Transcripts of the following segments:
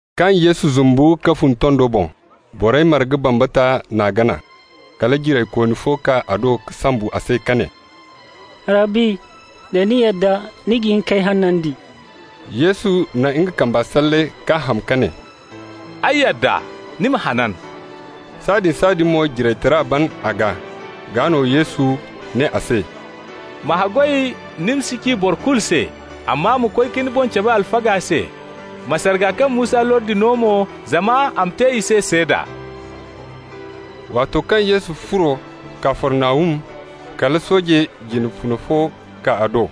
Kaŋ Yesu zumbu ka fun tondo boŋ, borey marga bambata n'a gana. Kala jiraykooni fo kaa a do ka sombu a se ka ne: «Rabbi, da ni yadda, ni ga hin k'ay hanandi.» Yesu na nga kambe salle k'a ham ka ne: «Ay yadda. Ni ma hanan.» Sahãadin-sahãadin mo jiraytara ban a gaa. Gaa no Yesu ne a se: «Ma haggoy ni ma si ci boro kulu se. Amma ma koy ka ni boŋ cabe alfaga se. Ma sarga kaŋ Musa lordi no mo, zama a ma te i se seeda.» Waato kaŋ Yesu furo Kafarnahum, kala sooje jine funa fo kaa a do.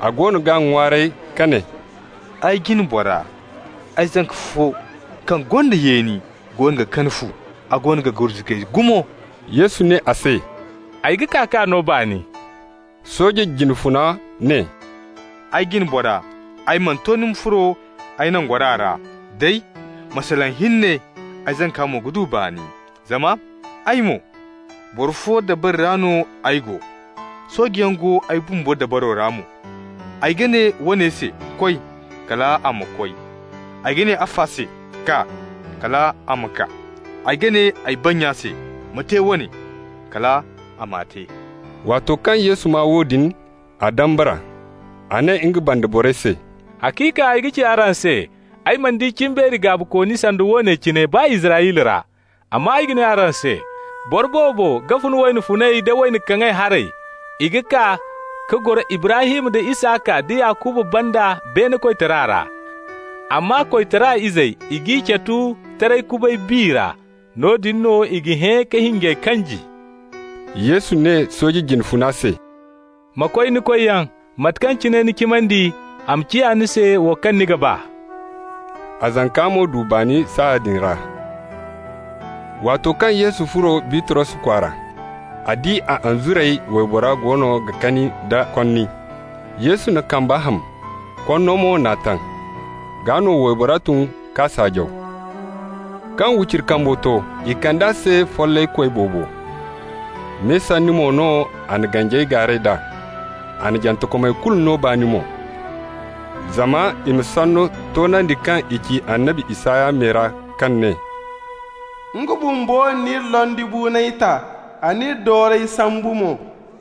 A goono g'a ŋwaaray ka ne: «Ay jina bora, ay zanka fo kaŋ gonda yeeni goono ga kani fu, a goono ga gurzugay gumo.» Yesu ne a se: «Ay ga kaa k'a no baani.» Sooje jine funa ne: «Ay jina bora, ay mana to ni ma furo ay nangora ra. Day, ma salaŋ hinne, ay zanka mo ga du baani. Zama ay mo, boro fo dabari ra no ay go, soojeyaŋ go ay bumbo dabaro ra mo. Ay ga ne woone se: ‹Koy!› -- kal a ma koy. Ay ga ne afo se: ‹Kaa!› -- kal a ma kaa. Ay ga ne ay bannya se: ‹Ma te woone!› -- kal a m'a te.» Waato kaŋ Yesu maa woodin, a dambara. A ne nga banda borey se: «Haciika ay ga ci araŋ se, ay mana di cimbeeri gaabikooni sanda woone cine, baa Israyla ra. Amma ay ga ne araŋ se: boro boobo ga fun wayna funay da wayna kaŋay haray, i ga kaa ka goro Ibrahim da Isaka da Yakuba banda beene koytara ra. Amma koytara izey, i g'i catu taray kubay bi ra. Noodin no i ga hẽ ka hinjey kanji.» Yesu ne sooje jine funa se: «Ma koy ni koyyaŋ. Mate kaŋ cine ni cimandi, a ma ciya ni se wo kaŋ ni ga ba.» A zanka mo du baani saaya din ra. Waato kaŋ Yesu furo Bitros kwaara, a di a anzuray waybora goono ga kani nda konni. Yesu n'a kamba ham, konno mo n'a taŋ. Gaa no waybora tun k'a saajaw. Kaŋ wiciri kambo to, i kand'a se follaykoy boobo. Me sanni mo no a na ganjey gaaray d'a, a na jantekomey kulu no baani mo. Zama i ma sanno toonandi kaŋ i ci annabi Isaya me ra, kaŋ ne: «Nga bumbo n'iri londibuunay ta, a n'iri doorey sambu mo.»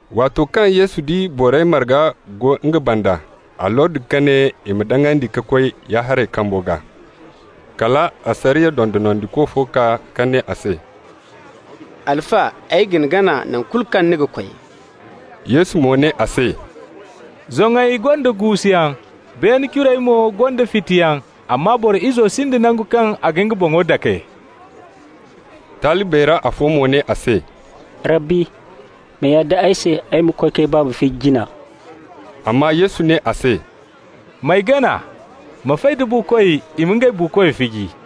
Waato kaŋ Yesu di borey marga go nga banda, a lordi ka ne i ma daŋandi ka koy ya-haray kambo gaa. Kala asariya dondonandiko fo kaa ka ne a se: «Alfa, ay ga ni gana nangu kulu kaŋ ni ga koy.» Yesu mo ne a se: «Zoŋey gonda guusuyaŋ, beene curey mo gonda fitiyaŋ, amma Boro Izo sinda nangu kaŋ a ga nga boŋo dake.» Talibey ra afo mo ne a se: «Rabbi, ma yadda ay se ay ma koy k'ay baaba fiji jina.» Amma Yesu ne a se: «M'ay gana. Ma fay da buukoy i ma ngey buukoy fiji.»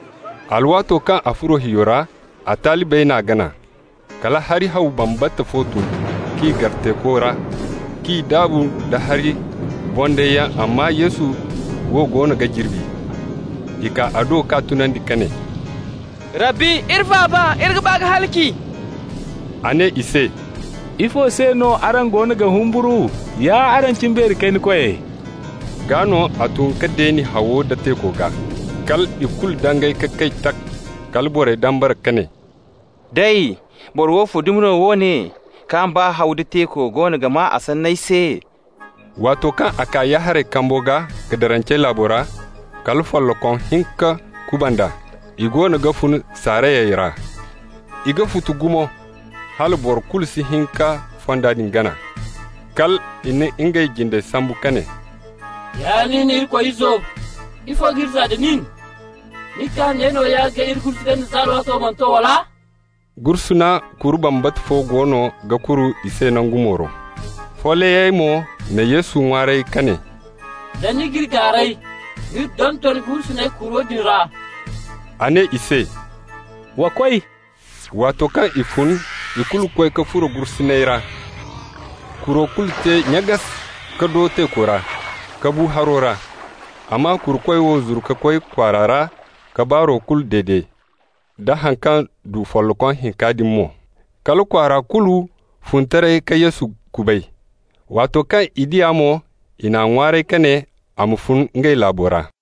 Alwaato kaŋ a furo hiyo ra, a talibey n'a gana. Kala hari haw bambata fo tun k'i gar teeko ra, k'i daabu nda hari bondayyaŋ, amma Yesu wo goono ga jirbi. I kaa a do k'a tunandi ka ne: «Rabbi, iri faaba! Iri ga ba ka halaci!» A ne i se: «Ifo se no araŋ goono ga humburu, ya araŋ cimbeeri kayna koyey?» Gaa no a tun ka deeni hawo da teeko gaa. Kal i kulu dangay ka kay, tak! Kala borey dambara ka ne: «Day, boro woofo dumi no woone, kaŋ baa haw nda teeko goono ga maa a sanney se?» Waato kaŋ a kaa ya-haray kambo gaa Gadarancey laabo ra, kala follokom hinka kuband'a, i goono ga fun saarayey ra. I ga futu gumo, hala boro kulu si hin ka fonda din gana. Kal i na ngey jindey sambu ka ne: «Ya nin Irikoy Izo! ifo k'iri zaa da nin! Ni kaa ne nooya k'iri gurzugandi za alwaato mana to, wala?» Gursuna kuru bambata fo goono ga kuru i se nangu mooro. Follayey mo na Yesu ŋwaaray ka ne: «Da ni g'iri gaaray, m'iri donton gursuney kuro din ra.» A ne i se: «Wa koy!» Waato kaŋ i fun, i kulu koy ka furo gursuney ra. Kuro kulu te nyagas ka do teeko ra, ka bu haro ra. Amma kurukoy wo zuru ka koy kwaara ra ka baaro kulu dede, da haŋ kaŋ du follokom hinka din mo. Kala kwaara kulu fun taray ka Yesu kubay. Waato kaŋ i di a mo, i n'a ŋwaaray ka ne a ma fun ngey laabo ra.